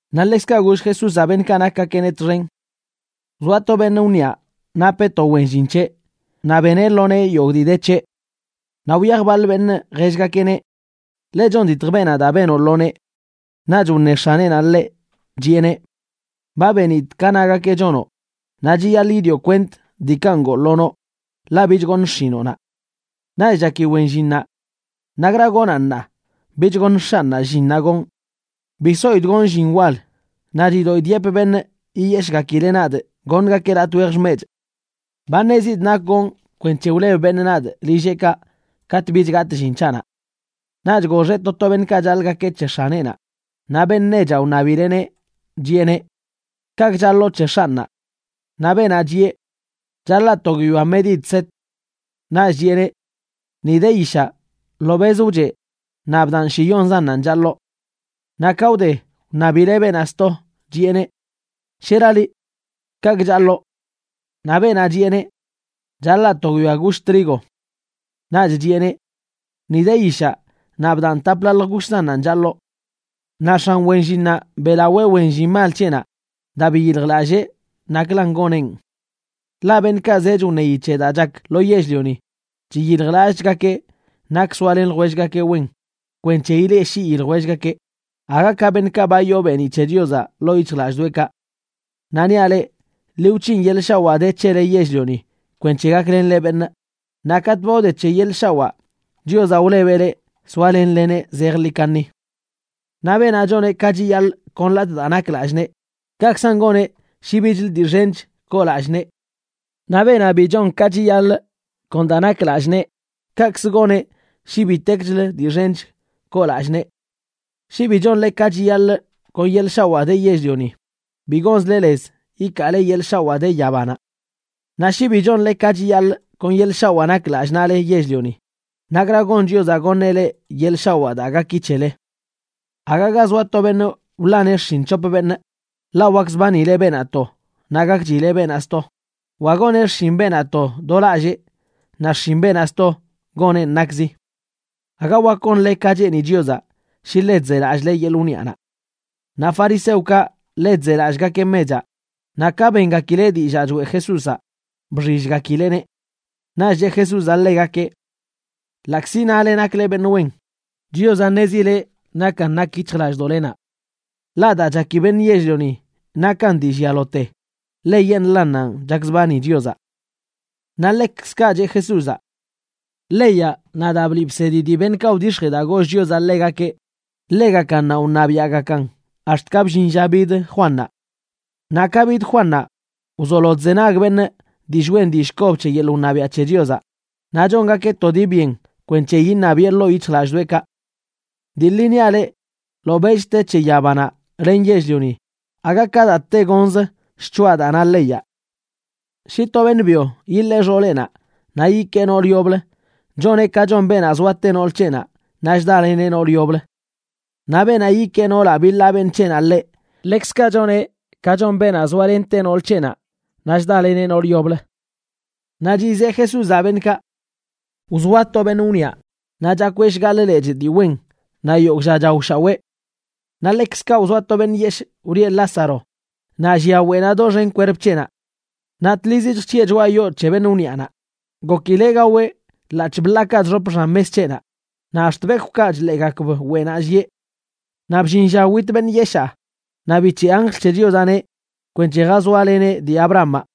Naꞌ ḻekzkaꞌ goll Jesúzaꞌ beṉꞌkaꞌ nakgakeꞌneꞌ txen: ―Wzoa to beṉꞌ wniꞌa napeꞌ to wen llin c̱heꞌ, naꞌ beneꞌ lo nee yogꞌ dii de c̱heꞌ. Naꞌ wyaj baḻ beṉꞌ jellgakeꞌneꞌ: “Ḻe chonditj beenaꞌ daa benoꞌ lo nee.” Naꞌch wṉe x̱aneꞌnaꞌ ḻeꞌ, chiꞌeneꞌ: “Ba benidꞌ ka nagakeꞌ chonoꞌ, naꞌ chiyaḻꞌ yidioꞌ kwent diikaꞌ ngoo lo noꞌ, ḻaꞌ bich goṉꞌ xshinoꞌnaꞌ.” Naꞌch chaki wen llinnaꞌ: “¿Nakra gonaꞌn ṉaa, bich goṉ x̱anꞌnaꞌ llinnaꞌ gonꞌ? Bi soidꞌ gonꞌ llin wal, naꞌ chidoꞌidꞌ yepꞌ beṉꞌ yiyeshꞌgakileꞌ nadꞌ goṉgakeꞌ latꞌ wej xmechꞌ. Ba ṉezidꞌ nak gonꞌ kwenc̱he wleb beṉꞌ nadꞌ lilleꞌkaꞌ katꞌ bich gatꞌ llin c̱haꞌnaꞌ.” Naꞌch goxeꞌ to to beṉꞌkaꞌ chaḻꞌgakeꞌ c̱he x̱aneꞌnaꞌ, naꞌ beṉꞌ nechaꞌ wṉabileꞌneꞌ, chiꞌeneꞌ: “¿Kaꞌkꞌ chaḻoo c̱he x̱anꞌnaꞌ?” Naꞌ beenaꞌ chiꞌe: “Chaḻaa to guiyoa medida set.” Naꞌch chiꞌeneꞌ: “Ni de yishaꞌ, ḻobeꞌzə wcheꞌ naꞌ bdaꞌn shiyonzannanꞌ chaḻoo.” Naꞌ ka wde, wṉabileꞌ beenaꞌ sto, chiꞌeneꞌ: “¿Shera liꞌ? ¿Kaꞌkꞌ chaḻoo?” Naꞌ beenaꞌ chiꞌeneꞌ: “Chaḻaa to guiyoa gush trigo.” Naꞌch chiꞌeneꞌ: “Ni de yishaꞌ naꞌ bdaꞌn taplaḻj gushzannanꞌ chaḻoo.” Naꞌ x̱an wen llinnaꞌ beꞌlawee wen llin mal c̱heꞌnaꞌ daa biyiljlallee naklan goneꞌn. Ḻaꞌ beṉꞌkaꞌ zech wṉeyi c̱he daa chak lo yell-lioni, chiyiljlallꞌchgakeꞌ nak soalen ljwellgakeꞌ wen kwenc̱he ileꞌshii ljwellgakeꞌ, aga ka beṉꞌkaꞌ ba yoo beeniꞌ c̱he Chiozaꞌ ḻoo yic̱hjlallꞌdoꞌekaꞌ. ’Naꞌ niaꞌ leꞌ, ḻi wc̱hin yeḻꞌ shawaa de c̱hele yell-lioni kwenc̱he gaklenle beṉꞌ, naꞌ katꞌ ba wde c̱he yeḻꞌ shawaa, Chiozaꞌ wlebeꞌ leꞌ soalenleneꞌ zejḻi kaṉi. ’Naꞌ beenaꞌ chon ka chiyaḻꞌ kon latꞌ daa nak lallꞌ nee, kaꞌkzan goneꞌ shi bichlə dii xench koo lallꞌ nee. Naꞌ beenaꞌ bi chon ka chiyaḻꞌ kon daa nak lallꞌ nee, kaꞌkzə goneꞌ shi bitekchlə dii xench koo lallꞌ nee. Shi bi chonle ka chiyaḻꞌ kon yeḻꞌ shawaa de yell-lioni, bi gonzle lez ikaale yeḻꞌ shawaa de yabanaꞌ. Naꞌ shi bi chonle ka chiyaḻꞌ kon yeḻꞌ shawaa nak lallꞌ naꞌle yell-lioni, ¿nakra gon Chiozaꞌ goṉeꞌ leꞌ yeḻꞌ shawaa daa gaki c̱hele? ’Aga ga zoa to beṉꞌ wḻaneꞌ xshin c̱hop beṉꞌ, ḻaꞌ wakzbanileꞌ beenaꞌ to, naꞌ gakchileꞌ beenaꞌ sto, wa goneꞌ xshin beenaꞌ to do lallee naꞌ xshin beenaꞌ sto goneꞌn nakzi. Aga wak gonle ka cheeni Chiozaꞌ shi ḻe chzelallꞌle yeḻꞌ wniꞌanaꞌ. Naꞌ fariseokaꞌ ḻe chzelallꞌgakeꞌ mechaꞌ, naꞌ ka bengakileꞌ dillaa choeꞌ Jesúzaꞌ, bxillgakileꞌneꞌ. Naꞌch cheꞌ Jesúzaꞌ ḻegakeꞌ: ―Ḻaꞌkzi nale nakle beṉꞌ wen, Chiozaꞌ ṉezileꞌ nakan nak yic̱hjlallꞌdoꞌlenaꞌ. Ḻaꞌ daa chaki beṉꞌ yell-lioni nakan dii llialote, ḻeyeṉꞌlannanꞌ chakzbani Chiozaꞌ. Naꞌ ḻekzkaꞌ cheꞌ Jesúzaꞌ: ―Leyaꞌ naꞌ daa bliꞌ bsedi dii beṉꞌkaꞌ wdix̱jee daa goll Chiozaꞌ ḻegakeꞌ, ḻegakannanꞌ wṉabiaꞌgakan ax̱t ka bllin lla bid Juannaꞌ. Naꞌ ka bid Juannaꞌ, wzolo chzenag beṉꞌ dillꞌ wen dillꞌ kob c̱he yeḻꞌ wṉabiaꞌ c̱he Chiozaꞌ, naꞌ chongakeꞌ to dii byen kwenc̱he iṉabiꞌe ḻoo yic̱hjlallꞌdoꞌekaꞌ. ’Dii ḻi niaꞌ leꞌ, ḻobeꞌch te c̱he yabanaꞌ len yell-lioni, aga ka daa tegonz shc̱hoꞌa daa na leyaꞌ. ’Shi to beṉꞌ byo yiḻee xooleꞌnaꞌ naꞌ yikee noolə yoblə, choneꞌ ka chon beenaꞌ zoate nool c̱heꞌnaꞌ naꞌ chdaleneꞌ noolə yoblə. Naꞌ beenaꞌ yikee noolaꞌ biḻaa beṉꞌ c̱heꞌnaꞌ ḻeꞌ, ḻekzkaꞌ choneꞌ ka chon beenaꞌ zoalente nool c̱heꞌnaꞌ naꞌ chdaleneꞌ noolə yoblə. Naꞌ chizeꞌ Jesúzaꞌ beṉꞌkaꞌ: ―Wzoa to beṉꞌ wniꞌa naꞌ chakweꞌ shgaḻꞌ lechꞌ dii wen naꞌ yogꞌ lla chaoshaweꞌ. Naꞌ ḻekzkaꞌ wzoa to beṉꞌ yeshꞌ wlieꞌ Lázaro, naꞌ llia weꞌnaꞌ doxen kwerp c̱heꞌnaꞌ. Naꞌ tlizi chjc̱hiꞌe choꞌa yoo c̱he beṉꞌ wniꞌanaꞌ, gokileꞌ gaweꞌ ḻaꞌc̱hꞌ bḻaakaꞌ chxop xan mes c̱heꞌnaꞌ, naꞌ ax̱t bekwꞌkaꞌ chḻeegakb weꞌnaꞌ llieꞌ. Naꞌ bllin lla wit beṉꞌ yeshaa, naꞌ bic̱heꞌ anjl c̱he Chiozaꞌneꞌ kwenc̱he jazoaleneꞌ dii Abrahamaꞌ.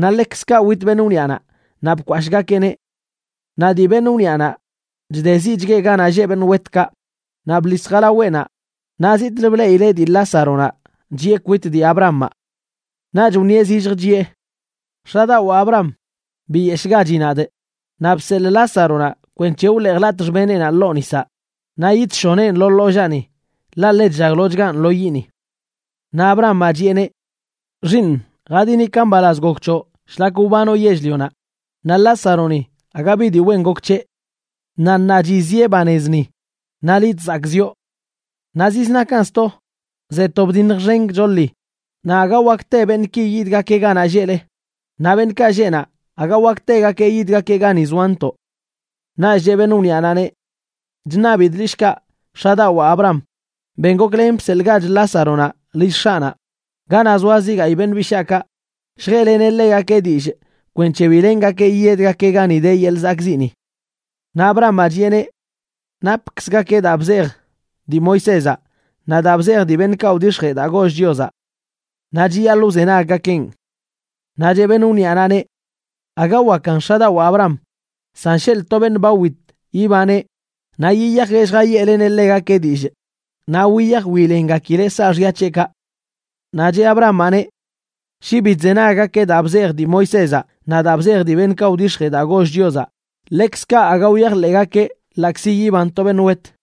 Naꞌ ḻekzkaꞌ wit beṉꞌ wniꞌanaꞌ naꞌ bkwashꞌgakeꞌneꞌ. Naꞌ dii beṉꞌ wniꞌanaꞌ chdeziꞌchgueꞌ ganaꞌ lleꞌ beṉꞌ wetkaꞌ, naꞌ bḻis jalaweꞌnaꞌ naꞌ zitꞌlə bleꞌileꞌ dii Lázaronaꞌ chiꞌe kwit dii Abrahamaꞌ. Naꞌch wṉieꞌ zilljə chiꞌe: “X̱adawaa Abraham, biyeshꞌgachi nadꞌ naꞌ bseḻꞌ Lázaronaꞌ kwenc̱he wḻeejlatꞌ xbeneꞌnaꞌ ḻoo nisaꞌ naꞌ yidshoneꞌn lo ḻollaani, ḻaꞌ ḻe chllaglochganꞌ lo yiꞌni.” Naꞌ Abrahamaꞌ chiꞌeneꞌ: “Xiiṉ, jadini ka mbalaz gok c̱hoꞌ shlak wbanoꞌ yell-lionaꞌ, naꞌ Lázaroni aga bi dii wen gok c̱heꞌ. Naꞌ ṉaa chiziꞌe banez ni, naꞌ liꞌ chzakꞌziꞌo. Naꞌ ziznakan sto, ze to bdiṉj xen gchoḻi, naꞌ aga wak te beṉꞌki yidgakeꞌ ganaꞌ lleꞌle, naꞌ beṉꞌkaꞌ lleꞌ naꞌ aga wak tegakeꞌ yidgakeꞌ gani zoantoꞌ.” Naꞌch cheꞌ beṉꞌ wniaꞌnaꞌneꞌ: “Chṉabidꞌ liꞌ shkaꞌ, x̱adawaa Abraham, ben goklen bseḻꞌgach Lázaronaꞌ lill x̱aꞌnaꞌ ganaꞌ zoa zi gayꞌ beṉꞌ bishaakaꞌ, lljeꞌleneꞌ ḻegakeꞌ dillꞌ kwenc̱he bi lengakeꞌ yiyedgakeꞌ gani de yeḻꞌ zakꞌziꞌni.” Naꞌ Abrahamaꞌ chiꞌeneꞌ: “Napkzgakeꞌ daa bzej dii Moisézaꞌ naꞌ daa bzej dii beṉꞌkaꞌ wdix̱jee daa goll Chiozaꞌ. ¡Naꞌ chiyaḻꞌ wzenaggakeꞌn!” Naꞌ cheꞌ beṉꞌ wniaꞌnaꞌneꞌ: “Aga wakan, x̱adawaa Abraham, san sheḻꞌ to beṉꞌ ba wit yibaneꞌ naꞌ yiyajeꞌ lljayeꞌleneꞌ ḻegakeꞌ dillꞌ, naꞌ wiyaj wilengakileꞌ saaxya c̱heꞌkaꞌ.” Naꞌ cheꞌ Abrahamaꞌneꞌ: “Shi bi chzenaggakeꞌ daa bzej dii Moisézaꞌ naꞌ daa bzej dii beṉꞌkaꞌ wdix̱jee daa goll Chiozaꞌ, ḻekzkaꞌ aga wyajḻeꞌgakeꞌ ḻaꞌkzi yiban to beṉꞌ wet.”